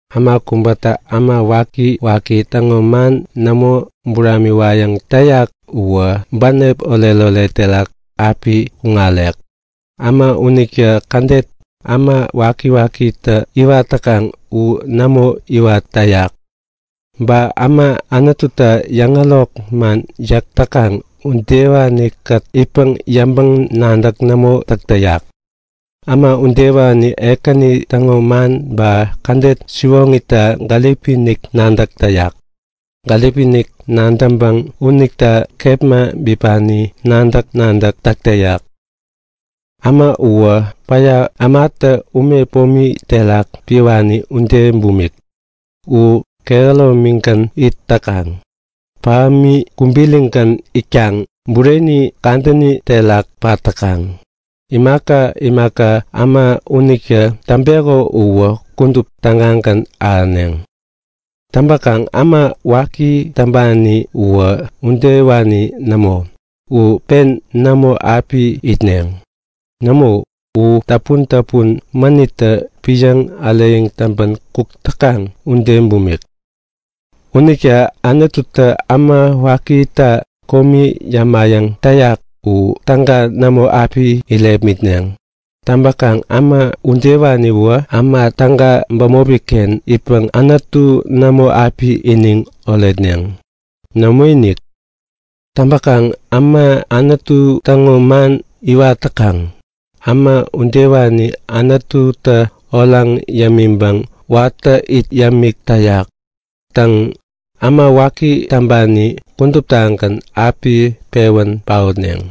Äma kubätä äma wakiwaki täŋo man nämo buramiwayäŋ täyak uwä bänep oretoret terak api kuŋarek. Äma unitä kädet äma wakiwakitä iwat täkaŋ u nämo iwat täyak. Ba äma Anututa yäŋärok man yäk täkaŋ udewanikät itpäŋ yäŋpäŋ-nadäk nämo täk täyak. Äma unitä Ekäni täŋo man ba kädet siwoŋita gäripi-inik nadäk täyak. Gäripiinik nadäŋpäŋ unita kepma bipani nadäk-nadäk epän täk täyak. Äma uwä päya ämatä ume pomi terak piwani ude bumik. U kehäromigän it täkaŋ. Pahämi kubirigän itkaŋ bureni kadäni terakgän pat täkaŋ. Imaka imaka äma unitä täŋpeko uwä kudup tägagän ahäneŋ. Täŋpäkaŋ äma waki täŋpani uwä udewani nämo. U pen nämo api itneŋ. Nämo, u täpun-täpun mänittä piäŋ äreyäŋ täŋpän kuk täkaŋ ude bumik. Unita Anututä äma wakita komi yämayäŋ täyak u täga nämo api irepmitneŋ. Täŋpäŋ äma udewaniwä äma täga bämopiken itpäŋ Anutu nämo api iniŋ oretneŋ. Nämoinik! Täŋpäkaŋ äma Anutu täŋo man iwat täkaŋ, äma udewani Anututä oraŋ yämiŋpäŋ watä it yämik täyak. Täŋ, äma waki täŋpani kuduptagän api pewän paotneŋ.